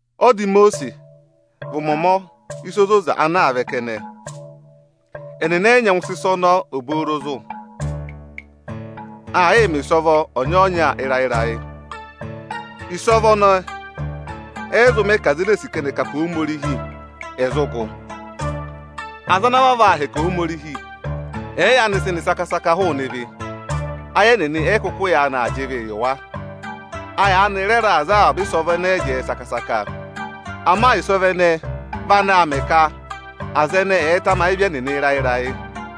Ọda Imosiisi vị ụmọmọ ịsa ozoza ana aa vẹ kẹnẹ, ẹnịnị ẹ yị nyẹngụ sị ịsa ọnọọ obooro zụ̀. Aa yịị mẹ̀ ịsọvọ ọnyọọnya ịrayị-ịrayị. Ịsọvọ ẹnẹẹ ẹ yị zụ mẹ ka aza ene ee sì ka ẹnị ẹ̀ kà pe Ohomorihi, ẹ̀ zụ gụ. Aza ana vavọọ aa hẹkẹ Ohomorihi ẹ̀ẹ yaanị sị nị saka-saka hụụnị ịvị, ayị ẹnịnị ẹ yị kụkụ yaanị aa jị ịvịị yị wa. A yaanị rẹ raà za avaba ịsọvọ ẹnẹẹ jẹẹ saka-saka. Ama ịsọvọ ẹnẹẹ vị anaā mẹ ka aza ẹnẹẹ ẹ̀ẹ tamayị ịvị ẹnịnị ịrayị-ịrayị.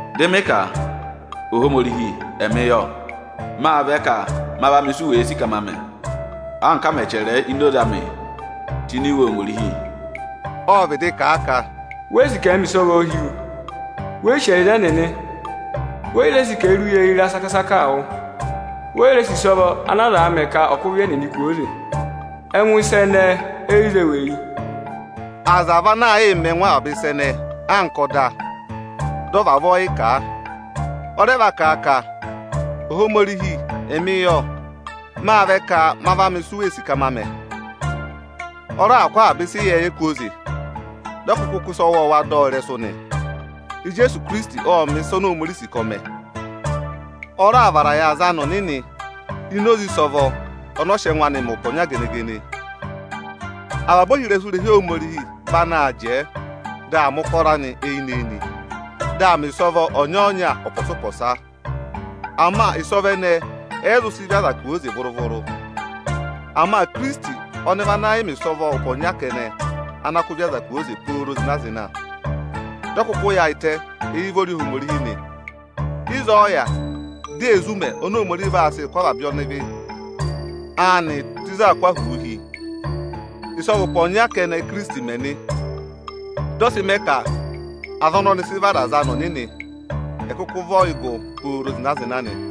Dị mị ka, “Ohomorihi, ẹmị yọ, máa vẹ ka ma va mẹ isi u wèe sì ka ma mẹ, anka a mẹ̀ chẹrẹ ẹ ini oze amị tụ́ ini Iwe Ohomorihi.” Ộ vịdị kà a ka, “We yi sì ka ẹ̀ẹ mẹ ịsọvọọ hi wu, we yi sì ẹyịza ẹnịnị, we yi re sì ka ẹ̀ẹ rị uye ịra saka-saka wụ. We yi re sì ịsọvọ ana azaā mẹ ka ọ̀ kụ́ ịvị ẹnịnị kwooze. Ẹngụ ịsa ẹnẹẹ e yi zé wu eyi.” Aza vị ana aa yịị mẹ ẹngụ avaba ịsa ẹnẹẹ anka ọda, dị ọ vavọọ yị kà. Ọ rẹ va kà a ka, “Ohomorihi, ọnị yọ, Ọnị ộ vẹ ka ọnị ọ̀ va mẹ ịsị u wèe sì ka ọnị ọ̀ mẹ.” Ọ raà kụ́ avaba ịsa ịyẹẹyẹ kwooze, dị ọ kụkụ kụ́ ịsa ọwọọwa dọ wa ịrẹsụ nị. Ijeesu Ikirisiti ộ mẹ̀ ịsa oni Ohomorihi sì ka ọ̀ mẹ. Ọ raà vara yị aza anị ọnịnị ini oze ịsọvọ ọnị ọ sị ẹngụ anị mẹ ụpẹ ọnya gene-gene. Avaba ohirẹsụ irehi Ohomorihi vị anaā jẹẹ, dị aa mẹ̀ ụkọrọ anị eyinị-eyinị, dị aa mẹ̀ ịsọvọ ọnyọọnya ụpọsa-ụpọsa. Ama ịsọvọ ẹnẹẹ ẹ yị zụ sị ịvị aza kwooze vụrụ-vụrụ. Ama Ikirisiti ọnị vị ana yị mẹ̀ ịsọvọ ụpẹ ọnya kẹnẹ ana kụ́ ịvị aza kwooze pooro zịna-zịna. Dị ọ kụkụ yaayịtẹ éyi ụvọrị Ohomorihi nị. Ịzọọ ọ yà, di ee zí ụmẹ oni Ohomorihi vaa sị kụ́ avaba ọnịvị anị tụ́ ịzị aā kụ́ ahụụ hi. Ịsọvọ ụpẹ ọnya kẹnẹ Ìkirisiti mẹ nị. Dị ọ sị mẹ ka aza ọnị ọnị sị vara aza anị ọnịnị, ẹ̀ kụkụ vị ọyịgụ pooro zịna-zịna nị.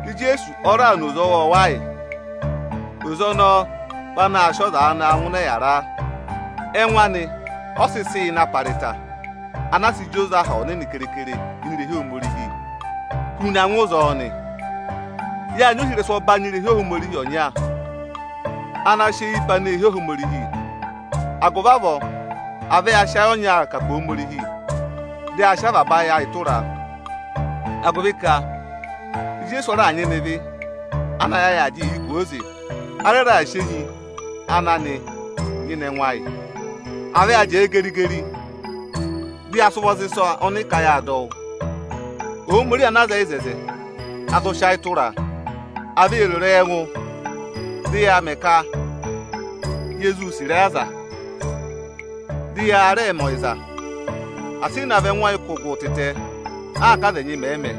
Ijeesu ọ raà na oze ọwọọwa yị. Oze ọnọọ vị anaā sịị ọza naa ngụ ịnị ọyịyara. Ẹngụ anị ọ sị sị yị na para ịta (ana a sị jị oze Aha Ọnịnị keekere ini irehi Ohomorihi) hu na ngụ ịzọọ nị. Yáa nyị ohirẹsụ ọbanyị irehi Ohomorihi ọnya ana sị eyi pe aneehi Ohomorihi. Agụvị avọọ, à vẹ ya sị ayị ọnya kà pe Ohomorihi, dị ya sị avaba ayị ayị tụra a, agụvị ka Ijeesu ọ raà nyịna ịvị ana ayị ayị aa jịị yị kwooze. A rẹ raà sị enyi ana nị nyịna ẹngụ ayị. À vẹ ya jẹẹ geri-geri, dị ya sị ụvọ za ịsa ọnị ị ka yáa dọ wụ́! Ohomorihi ana zẹẹ yị ịzẹzẹ, a zụ sị ayị tụra a. À vẹ yee ro ịrẹyị ẹngụ, dị yaa mẹ ka ye zuu sì ịrẹyị aza, dị ya rẹẹ mẹ ọyịza! Asị ị navọ ẹngụ ọyịkụgụ tịtẹ, anka aza ẹnyị mẹ̀ẹ̄ mẹ!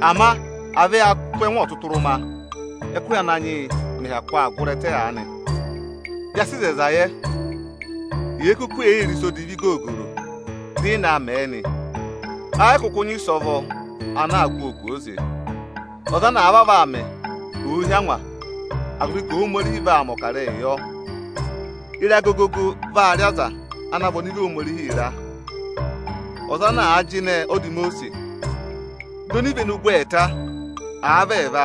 Ama à vẹ yaa tụ́ ẹngụ ọtụtụrụma, ẹ́kụhị Ananyị yị mẹ̀ hyakụ aa gụrị ẹtẹ aanị! Ya sị ịzẹyịza yẹ; yèe kuku ee yii re ịsa odivi googoro dị ị naa mẹẹ nị, ẹ yị kụkụ nyị ịsọvọ ana aa kụ́ ọọ kwooze. Ọza ana àa vavọọ aa mẹ, ò hí angwa, agụvị ka Ohomorihi vaa mẹ̀ ọkarẹyị yọ. Ịra gogogo vaa rị aza ana vị ọnịvị Ohomorihi ịra. Ọza ana àa jịnẹ ọda Imosiisi, dị onivenu gụ ẹẹta, àa vị ẹẹva,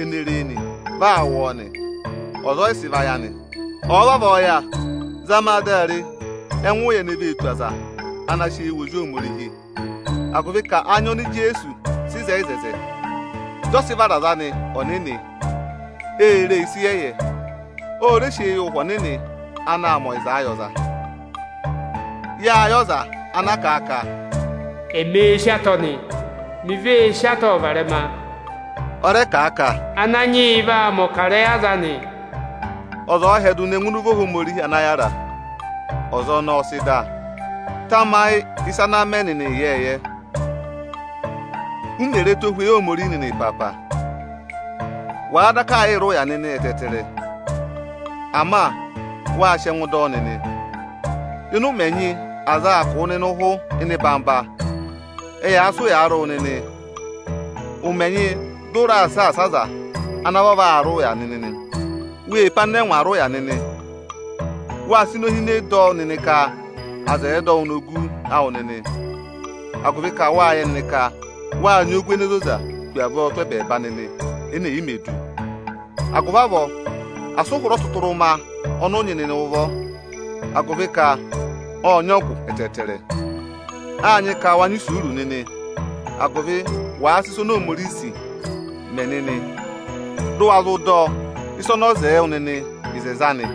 ene ree nị, vị aa wụ ọọ nị, ọza ọ yị sị vayị anị. Ọ̀ọ vavọọ yà, zama a dị a re ẹngụ ụya ene vee tù aza ana àa sị eyi wụ Ozi Ohomorihi, agụvị ka anya oni Ijeesu sị hị́ eku, dị ọ sị vara ọza anị ọnịnị, ee ree ịsa ịyẹyẹ. Ọ rẹ sị eyi wụ Ụhwẹ Ọnịnị anaā mẹ ọyịzaa yị ọza. Yáa yẹ ọza ana kà a ka, “Oni oō sí atọ nị, oni vee sí atọọ varẹma!” Ọ rẹ kà ka, “Ananyị yị vaa mẹ̀ ọkarẹyị aza anị.” Ọza ọ̀ọ hyẹdụ ne ngụ ịnị ụvọ Ohomorihi ana yára, ọza ọnọọ ọ sị dà. Tamayị ịsa ana mẹ nịnị ịyẹẹyẹ, u mè re ẹtohweyi Ohomorihi nịnị ịpaapa! Wa daka yị rị ụya nịnị ẹtẹẹtẹrẹ, ama wa sị sị ẹngụ dọ ọ nịnị. Ịnị ụmẹ ẹnyị aza aa kụ̀ wụ nịnị ụhụ ịnị ịnọyị-ịnọyị, ẹyaa sị ụyaa rị wụ nịnị. Ụmẹ ẹnyị dị ụ raa saasa aza ana vavọọ aa rị ụya nịnị. Wê pe anịnẹngwa rị ụya nịnị. Wáa sị inohine dọ ka aza ẹ̀ dọ wụ ogu awụ nịnị, agụvị ka wáa yẹ nịnị ka wáa nyị ogu ene zoza hu avọọ tụ́ ẹbẹẹba nịnị ene è yi mē du. Agụvị avọọ, asị ụ hụrẹ ọtụtụrụma ọnị ụ nyị nịnị ụvọ, agụvị ka ọ́ọ nyị ọgụ ẹtẹẹtẹrẹ! Áa nyị ka wa nyị isuuru nịnị, agụvị wàa ịsa oni Ohomorihi sì, mẹ nịnị, dụ wa zụ dọ ịsa ọnị ọ zẹẹ wụ nịnị ịzẹzẹ anị.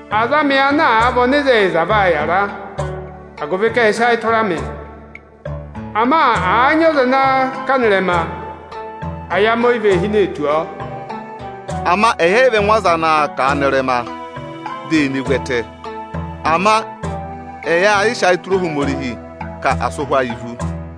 “Aza anị ana àa vị ọnịzẹyịza vaa yàra, agụvị ka ẹ́ẹ sị ayị tụra ọnị. Ama àa nyị ọza ana kà nọ ịrẹma, ayị anị o yi vee hinee tù ọọ.” Ama ẹyị ẹ yị vị ẹngụ aza anaā kà a nọ ịrẹma, dị è ne vu ẹtẹ. Ama ẹyị aa yịị sị ayịị tụra Ohomorihi, ka asị ụhwẹ ayị vú.